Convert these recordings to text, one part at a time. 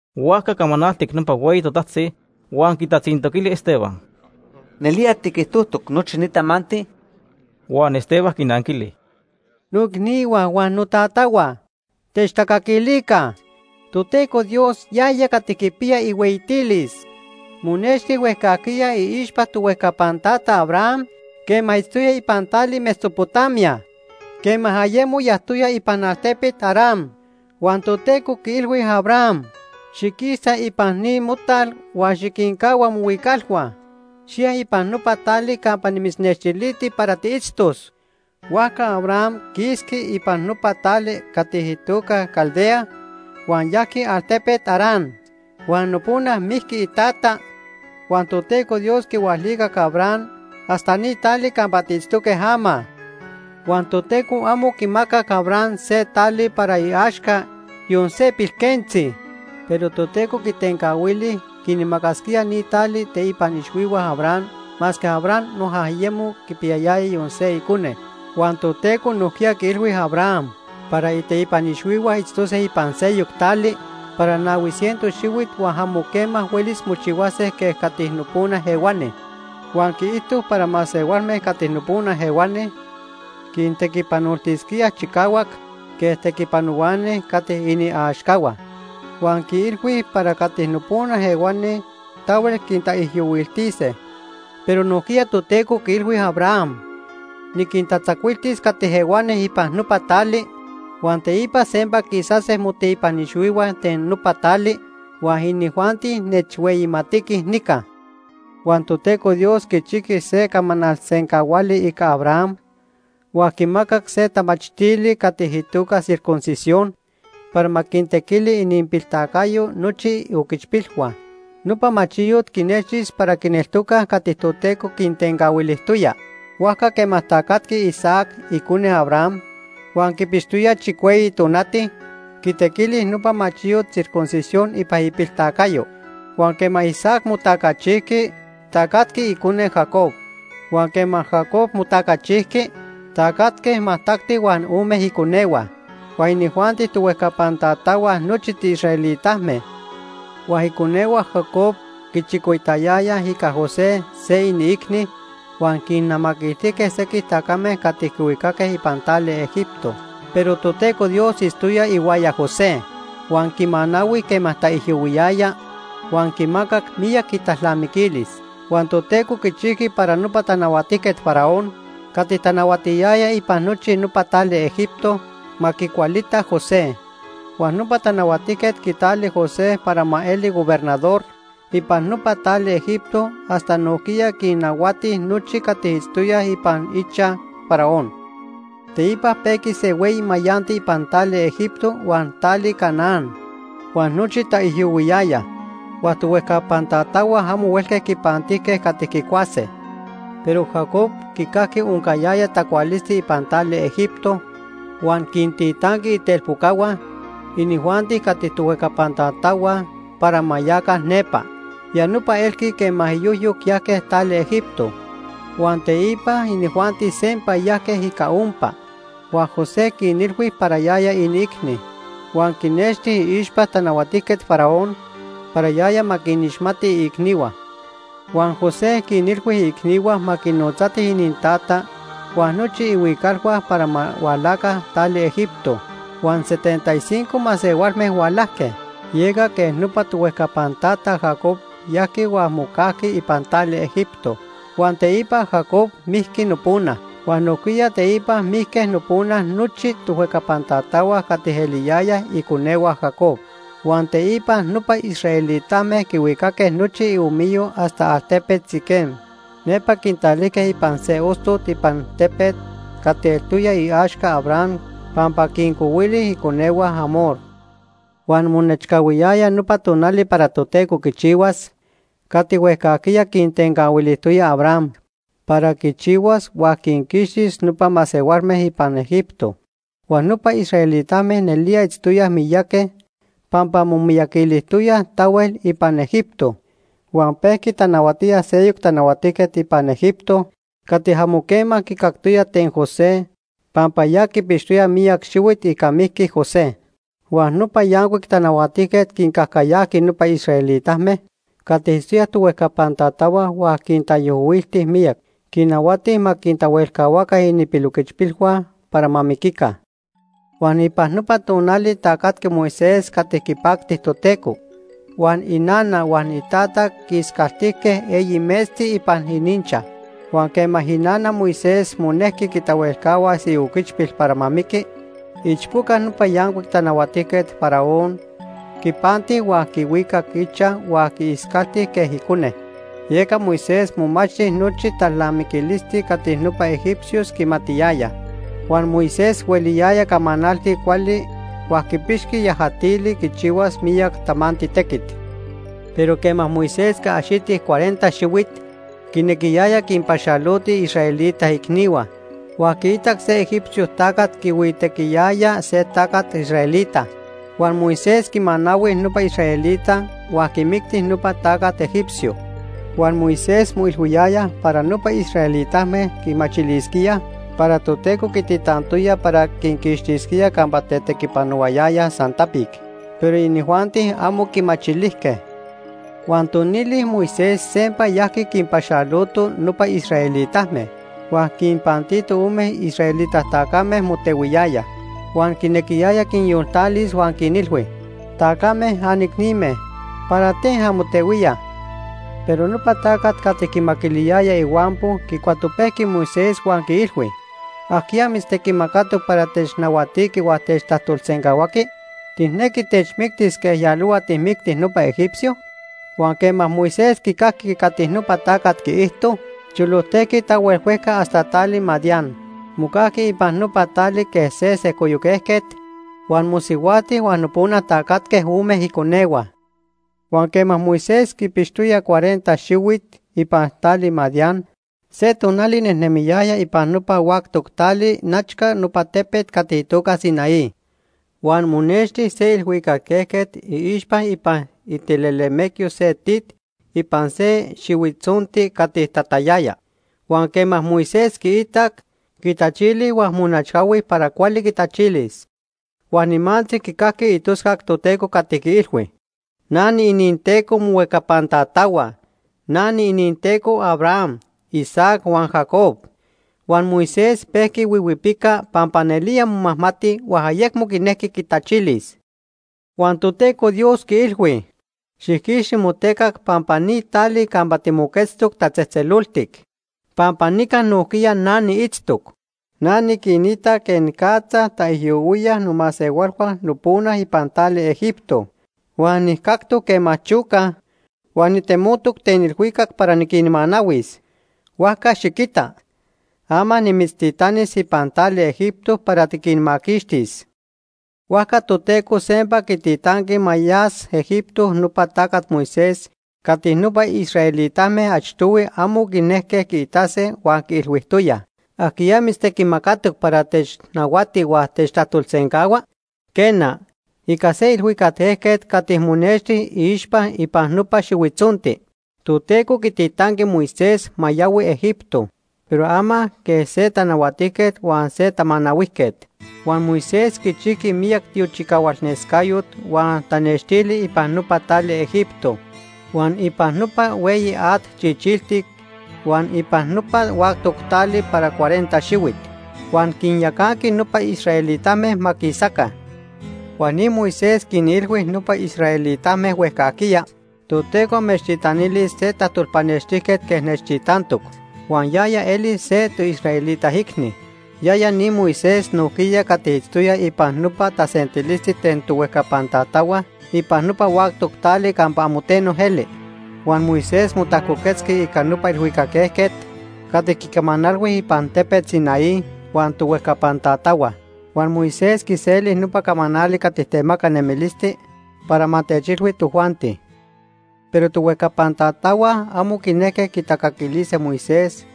Huajca camanaltic nopa hueyi totajtzi huan quitatzintoquili Esteban: ―¿Nelía tiquijtojtoc nochi ni tamanti? Huan Esteban quinanquili: “Noicnihua huan notatahua, techtacaquilica. Toteco Dios, yaya cati quipiya ihueyitilis, monexti huejcajquiya iixpa tohuejcapan tata Abraham quema itztoya ipan tali Mesopotamia, quema ayemo yajtoya ipan altepet Harán. Huan Toteco quiilhui Abraham: ‘Xiquisa ipan ni motal huan xiquincahua mohuicalhua. Xiya ipan nopa tali campa nimitznextiliti para tiitztos.’ “Huajca Abraham quisqui ipan nopa tali cati itoca Caldea, huan yajqui altepet Harán. Huan nopona mijqui itata, huan Toteco Dios quihualicac Abraham hasta ni tali campa tiitztoque ama. Huan Toteco amo quimacac Abraham se tali para iaxca, yon se pilquentzi. Pero Toteco quitencahuili quinmacasquía ni tali iteipan ixhuihua Abraham masque Abraham noja ayemo quipiyayaya yon se icone. Huan Toteco nojquiya quiilhui Abraham para iteipan ixhuihua itztose ipan seyoc tali para nahui ciento xihuit huan amo quema huelis mochihuase quej cati nopona ehuani. Huan quiijto para masehualme cati nopona ehuani quintequipanoltisquíaj chicahuac quej tequipanohuani cati iniaxcahua. Huan quiilhui para cati nopona ehuani tahuel quintaijyohuiltise. Pero nojquiya Toteco quiilhui Abraham: ‘Niquintatzacuiltis cati ehuani ipan nopa tali, huan teipa sempa quisase moteipan ixhuihua ten nopa tali huan inijuanti nechhueyimatiquij nica.’ “Huan Toteco Dios quichijqui se camanal sencahuali ica Abraham huan quimacac se tamachtili cati itoca circuncisión para ma quintequili ininpiltacayo nochi ioquichpilhua. Nopa machiyot quinextis para quineltocaj cati Toteco quintencahuilijtoya. Huajca quema tacatqui Isaac, icone Abraham, huan quipixtoya chicueyi tonati, quitequili nopa machiyot circuncisión ipan ipiltacayo. Huan quema Isaac motacachijqui, tacatqui icone, Jacob. Huan quema Jacob motacachijqui, tacatque majtacti huan ome iconehua. Huan inijuanti tohuejcapan tatahua nochi tiisraelitame. “Huan iconehua Jacob quichicoitayayaj ica José, se iniicni, huan quinnamaquiltijque sequij tacame cati quihuicaque ipan tali Egipto. Pero Toteco Dios itztoya ihuaya José, huan quimanahui quema taijyohuiyaya huan quimacac miyac italnamiquilis. Huan Toteco quichijqui para nopa Tanahuatijquet Faraón, cati tanahuatiyaya ipan nochi nopa tali Egipto, ma quicualita José. Huan nopa tanahuatijquet quitali José para ma eli gobernador ipan nopa tali Egipto hasta nojquiya quinnahuati nochi cati itztoyaj ipan ichaj Faraón. “Teipa pejqui se hueyi mayanti ipan tali Egipto huan tali Canaán, huan nochi taijyohuiyayaj. Huan tohuejcapan tatahua amo huelque quipantijque cati quicuase. Pero Jacob quicajqui oncayaya tacualisti ipan tali Egipto, huan quintitanqui itelpocahua, inijuanti cati tohuejcapan tatahua, para ma yaca nepa. Ya nopa elqui quema iyojyoc yajque tali Egipto. Huan teipa inijuanti sempa yajque ica ompa. Huan José quinilhui para yaya iniicni huan quinnexti iixpa Tanahuatijquet Faraón para yaya ma quinixmati iicnihua. Huan José quinilhui iicnihua ma quinotzatij inintata huan nochi ihuicalhua para ma hualaca tali Egipto. Huan setenta y cinco masehualme hualajque. Yeca quej nopa tohuejcapan tata Jacob yajqui huan mocajqui ipan tali Egipto. Huan teipa Jacob mijqui nopona. Huan nojquiya teipa mijque nopona nochi tohuejcapan tatahua cati eliyayaj iconehua Jacob. Huan teipa nopa israelitame quihuicaque nochi iniomiyo hasta altepet Siquem. Nepa quintalijque ipan se ostot ipan tepet cati eltoya iaxca Abraham pampa quincohuili iconehua Hamor. “Huan monechcahuiyaya nopa tonali para Toteco quichihuas cati huejcajquiya quitencahuilijtoya Abraham para quichihuas huan quinquixtis nopa masehualme ipan Egipto. Huan nopa israelitame nelía itztoyaj miyaqui pampa momiyaquilijtoyaj tahuel ipan Egipto. Huan pejqui tanahuatía seyoc tanahuatijquet ipan Egipto cati amo quema quicactoya ten José pampa ya quipixtoya miyac xihuit ica mijqui José. Huan nopa yancuic tanahuatijquet quincajcayajqui nopa israelitame cati itztoyaj tohuejcapan tatahua huan quintaijyohuilti miyac. Quinnahuati ma quintahuelcahuaca ininpiloquichpilhua para ma miquica. “Huan ipan nopa tonali tacatqui Moisés cati quipacti Toteco. Huan inana huan itata quiiscaltijque eyi metzti ipan ininchaj. Huan quema inana Moisés monejqui quitahuelcahuas ioquichpil para ma miqui, iichpoca nopa yancuic tanahuatijquet Faraón quipanti huan quihuicac ichaj huan quiiscalti quej icone. Yeca Moisés momachti nochi talnamiquilisti cati nopa egipcios quimatiyayaj. Huan Moisés hueliyaya camanalti cuali huan quipixqui yajatili quichihuas miyac tamanti tequit. “Pero quema Moisés quiaxiti cuarenta xihuit, quinequiyaya quinpaxaloti iisraelita icnihua. Huan quiitac se egipcio tacat quihuitequiyaya se tacat israelita. Huan Moisés quimanahui nopa israelita huan quimicti nopa tacat egipcio. Huan Moisés moilhuiyaya para nopa israelitame quimachilisquíaj para Toteco quititantoya para quinquixtisquía campa tetequipanohuayayaj san tapic, pero inijuanti amo quimachilijque. Huan tonili Moisés sempa yajqui quinpaxaloto nopa israelitame. Huan quinpantito ome israelita tacame motehuiyayaj. Huan quinequiyaya quinyoltalis huan quinilhui: ‘Tacame, anicnime, ¿para ten anmotehuíaj?’ “Pero nopa tacat cati quimaquiliyaya ihuampo quicuatopejqui Moisés huan quiilhui: ‘¿Ajquiya mitztequimacatoc para technahuatiqui huan techtajtolsencahuaqui? ¿Tijnequi techmictis quej yalohua tijmicti nopa egipcio?’ Huan quema Moisés quicajqui cati nopa tacat quiijto, cholojtejqui tahuel huejca hasta tali Madián. Mocajqui ipan nopa tali quej se sejcoyoc ejquet, huan mosihuajti huan nopona tacatque ome iconehua. “Huan quema Moisés quipixtoya cuarenta xihuit ipan tali Madián, se tonali nejnemiyaya ipan nopa huactoc tali nechca nopa tepet cati itoca Sinaí. Huan monexti se ilhuicac ejquet iixpa ipan itilelemecyo se tit ipan se xihuitzonti cati tatayaya. Huan quema Moisés quiitac, quitachili huan monechcahui para cuali quitachilis. Huan nimantzi quicajqui itoscac Toteco cati quiilhui: ‘Na niininTeco mohuejcapan tatahua. Na niininTeco Abraham, Isaac huan Jacob.’ Huan Moisés pejqui huihuipica pampa nelía momajmati huan ayecmo quinejqui quitachilis. Huan Toteco Dios quiilhui: ‘Xijquixti motecac pampa ni tali campa timoquetztoc tatzejtzeloltic pampa nica nojquiya na niitztoc. Na niquinita quenicatza taijyohuíaj nomasehualhua nopona ipan tali Egipto, huan nijcactoc quema chocaj huan nitemotoc ten ilhuicac para niquinmanahuis. Huajca xiquita, ama nimitztitanis ipan tali Egipto para tiquinmaquixtis.’ “Huajca Toteco sempa quititanqui ma yas Egipto nopa tacat Moisés cati nopa israelitame achtohui amo quinejque quiitase huan quiilhuijtoyaj: ‘¿Ajquiya mitztequimacatoc para technahuati huan techtajtolsencahua?’ Quena, ica se ilhuicac ejquet cati monexti iixpa ipan nopa xihuitzonti, Toteco quititanqui Moisés ma yahui Egipto, pero ama quej se tanahuatijquet huan se tamanahuijquet. Huan Moisés quichijqui miyac tiochicahualnescayot huan tanextili ipan nopa tali Egipto, huan ipan nopa Hueyi At Chichiltic huan ipan nopa huactoc tali para cuarenta xihuit. Huan quinyacanqui nopa israelitame ma quisaca. Huan ni Moisés quinilhui nopa israelitame huejcajquiya: ‘Toteco amechtitanilis se tajtolpanextijquet quej nechtitantoc huan yaya elis se toisraelita icni.’ Yaya ni Moisés nojquiya cati itztoya ipan nopa tasentilisti ten tohuejcapan tatahua ipan nopa huactoc tali campa amo teno eli. Huan Moisés motajcoquetzqui ica nopa ilhuicac ejquet cati quicamanalhui ipan tepet Sinaí huan tohuejcapan tatahua. Huan Moisés quiseli nopa camanali cati temaca nemilisti para ma techilhui tojuanti. “Pero tohuejcapan tatahua amo quinejque quitacaquilise Moisés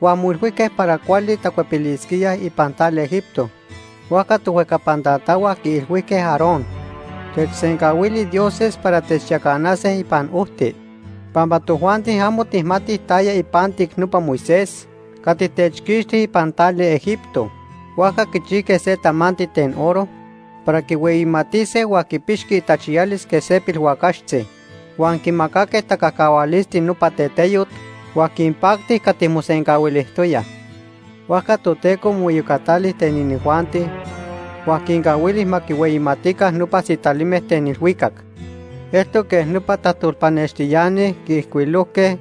huan moilhuijque para cuali tacuepilisquíaj ipan tali Egipto. Huajca tohuejcapan tatahua quiilhuijque Aarón: ‘Techsencahuili dioses para techyacanase ipan ojti, pampa tojuanti amo tijmatij taya ipantic nopa Moisés cati techquixti ipan tali Egipto.’ Huajca quichijque se tamanti ten oro para quihueyimatise huan quipixqui itachiyalis quej se pilhuacaxtzi. Huan quimacaque tacajcahualisti nopa teteyot huan quinpacti cati mosencahuilijtoyaj. Huajca Toteco moiyocatali ten inijuanti huan quincahuili ma quinhueyimatica nopa sitalime ten ilhuicac. Eltoc quej nopa tajtolpanextiani quiijcuilojque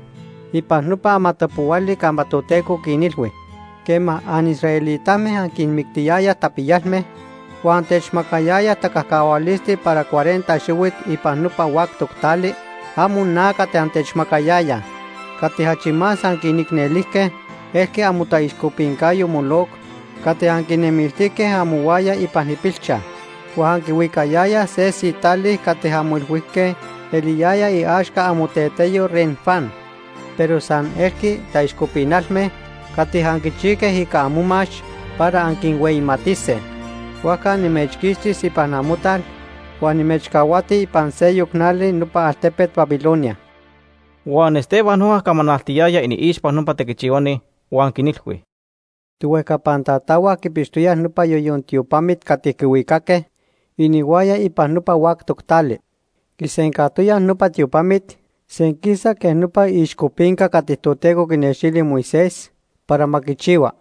ipan nopa amatapohuali campa Toteco quinilhui: ‘Quema anisraelitame anquinmictiyayaj tapiyalme, huan antemacayayaj tacajcahualisti para cuarenta xihuit ipan nopa huactoc tali, amo na cati antechmacayayaj. Cati achi más anquiicnelijque elqui amotaixcopincayo Moloc cati anquinejnemiltijque amohuaya ipan ipilchaj. Huan anquihuicayayaj se sitali cati anmoilhuijque eliyaya iaxca amoteteyo Renfán. Pero san elqui taixcopinalme cati anquichijque ica amomax para anquinhueyimatise. Huajca nimechquixtis ipan amotal huan nimechcahuati ipan seyoc nali nopa altepet Babilonia.’” Huan Esteban noja camanaltiyaya iniixpa nopa tequichihuani huan quinilhui: “Tohuejcapan tatahua quipixtoyaj nopa Yoyon Tiopamit cati quihuicaque inihuaya ipan nopa huactoc tali. Quisencajtoyaj nopa tiopamit senquisa quej nopa iixcopinca cati Toteco quinextili Moisés para ma quichihua.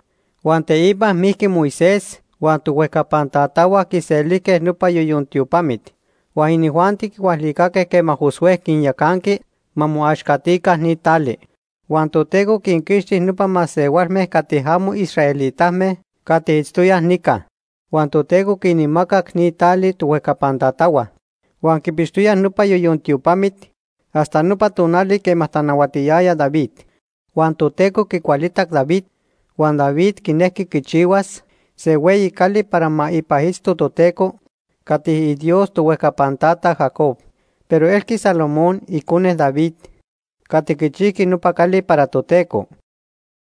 Huan teipa mijqui Moisés huan tohuejcapan tatahua quiselijque nopa Yoyon Tiopamit. Huan inijuanti quihualicaque quema Josué quinyacanqui ma moaxcatica ni tali. Huan Toteco quinquixti nopa masehualme cati amo israelitame cati itztoyaj nica. Huan Toteco quinmacac ni tali tohuejcapan tatahua. Huan quipixtoyaj nopa Yoyon Tiopamit hasta nopa tonali quema tanahuatiyaya David. Huan Toteco quicualitac David, huan David quinejqui quichihuas se hueyi cali para ma ipan itzto Toteco, cati iDios tohuejcapan tata Jacob. Pero elqui Salomón, icone David, cati quichijqui nopa cali para Toteco.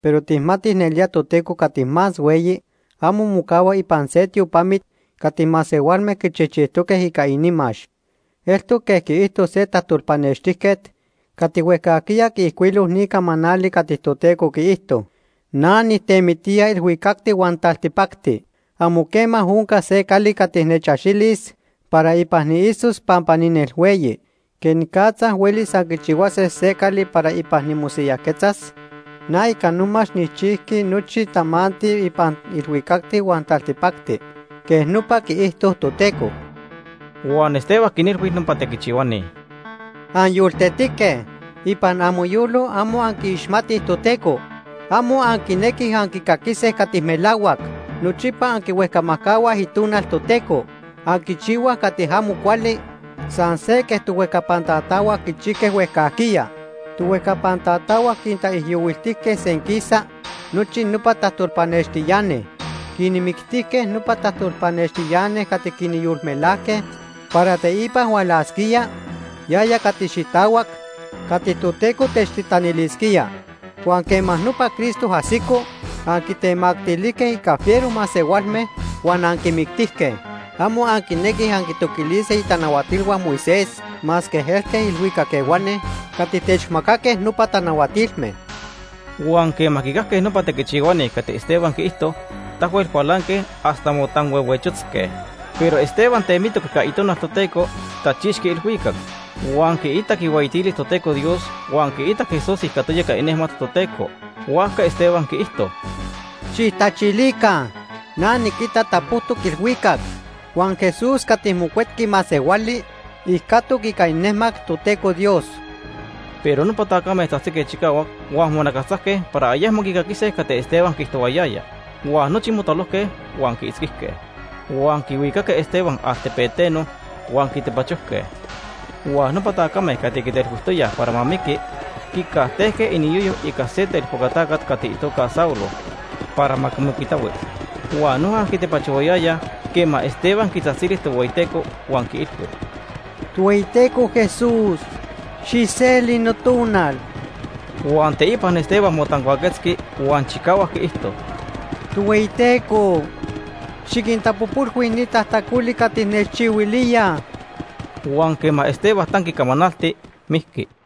Pero tijmatij nelía Toteco Cati Más Hueyi amo mocahua ipan se tiopamit cati masehualme quichijchijtoque ica inimax. Eltoc quej quiijto se tajtolpanextijquet cati huejcajquiya quiijcuilo ni camanali cati Toteco quiijto: ‘Na nijtemitía ilhuicacti huan taltipacti. Amo quema oncas se cali cati nechaxilis para ipan niitztos pampa ninelhueyi. ¿Quenicatza huelis anquichihuase se cali para ipan nimosiyajquetzas? Na ica nomax nijchijqui nochi tamanti ipan ilhuicacti huan taltipacti.’ Quej nopa quiijto Toteco.” Huan Esteban quinilhui nopa tequichihuani: “¡Anyoltetique! Ipan amoyolo amo anquiixmatij Toteco. Amo anquinequij anquicaquise cati melahuac. Nochipa anquihuejcamajcahuaj Itonal Toteco. Anquichihuaj cati amo cuali san se quej tohuejcapan tatahua quichijque huejcajquiya. Tohuejcapan tatahua quintaijyohuiltijque senquisa nochi nopa tajtolpanextiani. Quinmictijque nopa tajtolpanextiani cati quinyolmelajque para teipa hualasquía Yaya Cati Xitahuac cati Toteco techtitanilisquía. Huan quema nopa Cristo ajsico, anquitemactilijque ica fiero masehualme huan anquimictijque. Amo anquinequij anquintoquilise itanahuatilhua Moisés masque elque ilhuicac ehuani cati techmacaque nopa tanahuatilme.” Huan quema quicajque nopa tequichihuani cati Esteban quiijto, tahuel cualanque hasta motanhuehuechotzque. Pero Esteban temitoc ica Itonal Toteco, tachixqui ilhuicac. Huan quiitac ihueyitilis Toteco Dios huan quiitac Jesús ijcatoya ica inejmat Toteco. Huajca Esteban quiijto: ―¡Xijtachilica! Na niquita tapojtoc ilhuicac huan Jesús cati Mocuetqui Masehuali ijcatoc ica inejmat Toteco Dios. Pero nopa tacame tzajtzique chicahuac huan monacastzajque para ayecmo quicaquise cati Esteban quiijtohuayaya. Huan nochi motalojque huan quiitzquijque. Huan quihuicaque Esteban altepeteno huan quitepachojque. Huan nopa tacame cati quitelhuijtoyaj para ma miqui quicajtejque iniyoyo ica se telpoca tacat cati itoca Saulo para ma quimocuitahui. Huan noja quitepachohuayayaj quema Esteban quitzajtzili Tohueyiteco huan quiilhui: “Tohueyiteco Jesús, xijseli notonal.” Huan teipa Esteban motancuaquetzqui huan chicahuac quiijto: “Tohueyiteco, xiquintapojpolhui ni tajtacoli cati nechchihuilíaj.” Huan quema Esteban tanqui camanalti, mijqui.